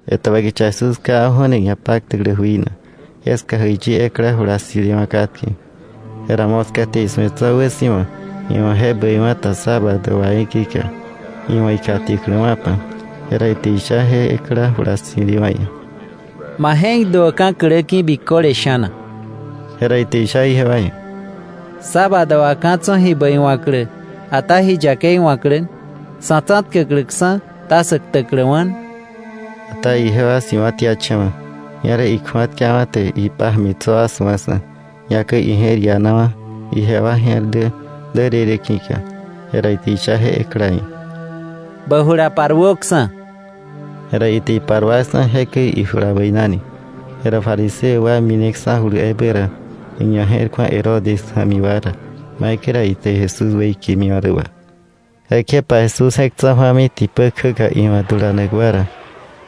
Etäbä kicha Jesús kjawa̱ju̱ni ñapaktäklä jui na, jeska jäiyi ekla jula ssi̱lewa̱ katke. Jera moska te isu̱e tso̱ wäsi̱wa iwa̱ je bäiwa̱ ta sábado wà í̱ ki̱ka, iwa̱ ikjatiäkläwa̱pa. Jera ite isha je ekla jula ssi̱lewa̱ ia̱: —Ma je̱k duöka̱ klä ki̱, biköle sha̱na. Jera ite isha ijewa ia̱: —¿Sábado wà ka̱ tso̱ ji bäi wa̱klä, ata ji yakei wa̱klä? ¿Sa̱ tsa̱tkäkläksa̱, ta sä ktäkläwa̱? Ata ijewa si̱wa̱tiacha̱wa̱. Ñerä ikju̱atkawa̱ te ipája̱mi tso̱ wa su̱aksa̱, ñakäi ije̱r ianawa̱ ijewa je̱r dä därërë ki̱ka. Jera ite isha je ekla ia̱: —Bä jula paruöksa̱. Jera ite iparuaksa̱, jekäi ijula bäinani. Jera fariseo wa mineksa̱julu ebä ra, iñaje̱rku̱a Herodes ja̱mi wa ra maikäi ra ite Jesús weikemiwa̱ rä wà. Jekjepa Jesús je̱k tsa̱ju̱ami tipä kjäka iwa̱ dulanak wa ra.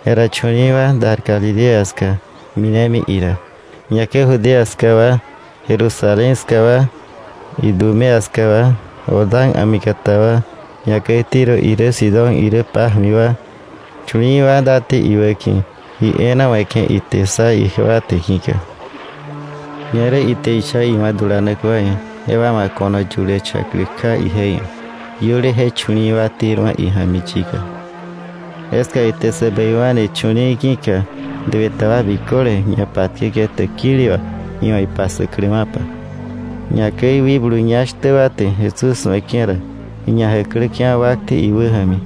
Jera chu̱li̱i̱wa̱ dar Galilea ska minemi ira. Ñakäi Judea ska wa, Jerusalén ska wa, Idumea ska wa, Jordán a̱mikata wa, ñakäi Tiro irä Sidón irä pája̱mi wa, chu̱li̱i̱wa̱ date iwäki̱, ji e̱e̱na we̱ke̱ ite ssa ijewa te ki̱ka. Ñerä ite isha iwa̱ dulanak wa ia̱, jewa wa̱ ko̱no yulächa̱klä kja ije ia̱, iöle je chu̱li̱i̱ wa terwa̱ ija̱mi yika. Jeska ite sä bäiwa̱ni chu̱li̱i̱ ki̱ka duë ta wa biköle ñapatkäke̱ täkili wà iwa̱ ipassäkläwa̱pa. Ñakäi wikblu ñá shtä wa te Jesús su̱eke̱ ra, iñajäkläke̱wa̱ wakte iwäja̱mi,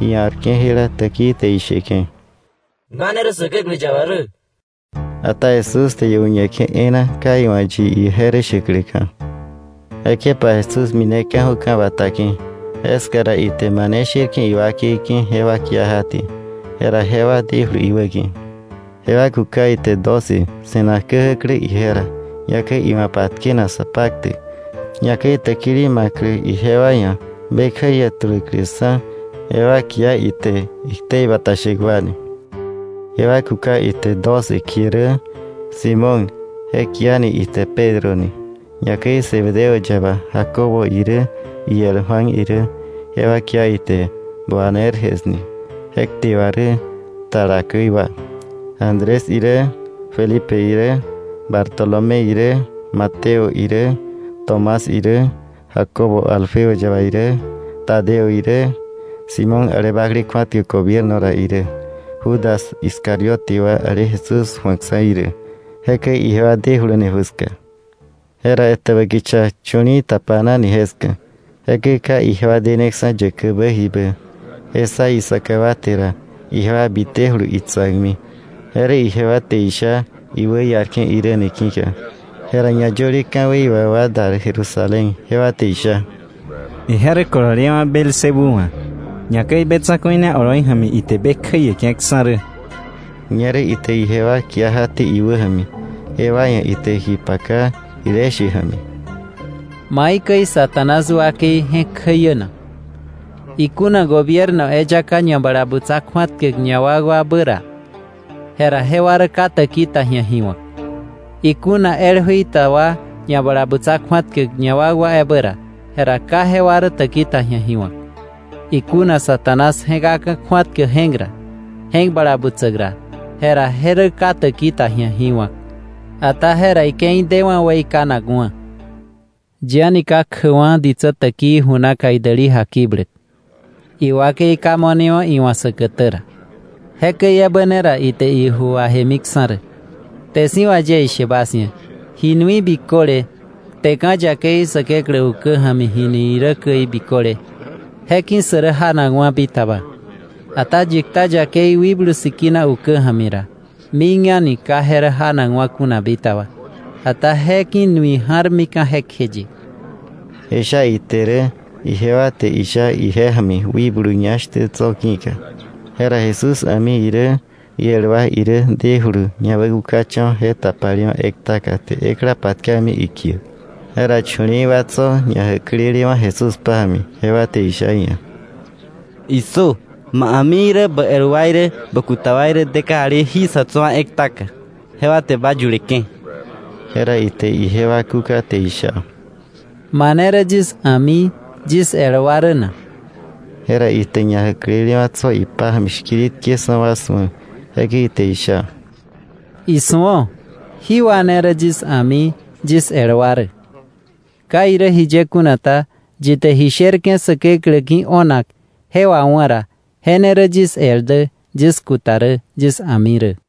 ia̱rke̱ jela täkii te isheke̱: —Ba ne rä Säkeklä yaba rä. Ata Jesús te iu̱ñeke̱ e̱e̱na ka iwa̱ yi ije rä shäkläka̱. Jekjepa Jesús mineka̱ju̱ ka̱ bata ki̱, jeska ra ite mane sherke̱ iwakei ki̱ jewa kia jaté, jera jewa dejulu iwäki̱. Jewa kuka ite doce, se̱nak käjäklä ije ra, ñakäi iwa̱ patkenak sa paktäk, ñakäi täkili ma̱klä ijewa ia̱ be kjäiä tuläkläksa̱. Jewa kia ite iktei bata shäk wa ni. Jewa kuka ite doce kie rä: Simón, je kiani ite Pedro ni; ñakäi Zebedeo yaba Jacobo irä, iel Juan irä, jewa kia ite Boanerges ni (je kte wà rä “Tala käi wa”); Andrés irä, Felipe irä, Bartolomé irä, Mateo irä, Tomás irä, Jacobo Alfeo yaba irä, Tadeo irä, Simón ale bakle kju̱atkäk gobierno ra irä, Judas Iscariote wa, ale Jesús ju̱akksa̱ irä. Jekäi ijewa dejuluni ju ska. Jera etäbä kicha chu̱li̱i̱ tapanani jeska, jekäi ka ijewa deneksa̱ yäkäkbä jibä. Je ssa isaka wa te ra, ijewa bitejulu itsa̱kmi, je rä ijewa te isha iwäiarke̱ irä ni ki̱ka. Jera ñayöle ka̱wei wà wa dar Jerusalén, jewa te isha: “Ije rä kololewa̱ Beelzebú wa̱, ñakäi be tsa̱ku̱i ne oloi ja̱mi ite be kjäieke̱ksa̱ rä.” Ñerä ite ijewa kia jaté iwäja̱mi, jewa ia̱ ite ji paka jile she ja̱mi: “¿Maikäi Satanás wakei je̱k kjäiä na? Ikuna gobierno eyaka ñabalabutsa kju̱atkäk ñawakwabä ra, jera jewa rä ka täki ta ji̱a ji wa̱k. Ikuna el jui ta wa ñabalabutsa kju̱atkäk ñawakwabä ra, jera jewa rä ka täki ta ji̱a ji wa̱k. Ikuna Satanás je̱kaka̱ kju̱atkäk je̱k ra, je̱k bala butsäk ra, jera je rä ka täki ta ji̱a ji wa̱k, ata jera ike̱i dewa̱ weikanakwa̱. “Yi a̱ni ka kjäkwa̱ ditsä täkii ju naka idäli jakibläk, iwakei ka mo̱newa̱ iwa̱ säkätä ra. Jekäi ebä ne ra ite iju wajemiksa̱ rä. “Kte si̱ wà yie ishe bas ia̱, ji nui biköle, kteka̱ yakei Säkeklä ukä ja̱mi jini irä käi biköle, je ki̱ sä rä janakwa̱ bitaba. Ata yi kta yakei Wikblu Sikina ukä ja̱mi ra, mik a̱ni ka je rä janakwa̱ kuna bitaba, ata je ki̱ nui ja̱rmika̱ jekjeye.” Je sha ite rä, ijewa te isha ije ja̱mi wikblu ñá shtä tso̱ ki̱ka. Jera Jesús a̱mi irä, iel wa irä dejulu ñawäkukacha̱wa̱ je tapalewa̱ ektaka te ekla patkami ikiäk. Jera chu̱li̱i̱ wa tso̱ ñajäklelewa̱ Jesús pája̱mi, jewa te isha iia̱: —¡Issö! Ma a̱mi irä bä el wa irä, bä kuta wa irä de kajali jí sa̱ tso̱ wa ektaka, jewa te ba yuleke̱. Jera ite ijewa kúka te isha: —¿Mane rä yis a̱mi, yis el wa rä na? Jera ite ñajäklelewa̱ tso̱ ipája̱mi shkiritkeksa̱ wa su̱a, jekäi ite isha: —¡Isu̱o! Jí wa ne rä yis a̱mi, yis el wa rä. Ka irä jiye kuna ta, yi te ji sherke̱ Säkeklä ki̱ o̱nak je wawá̱ ra, je ne rä yis el dä, yis kuta rä, yis a̱mi rä.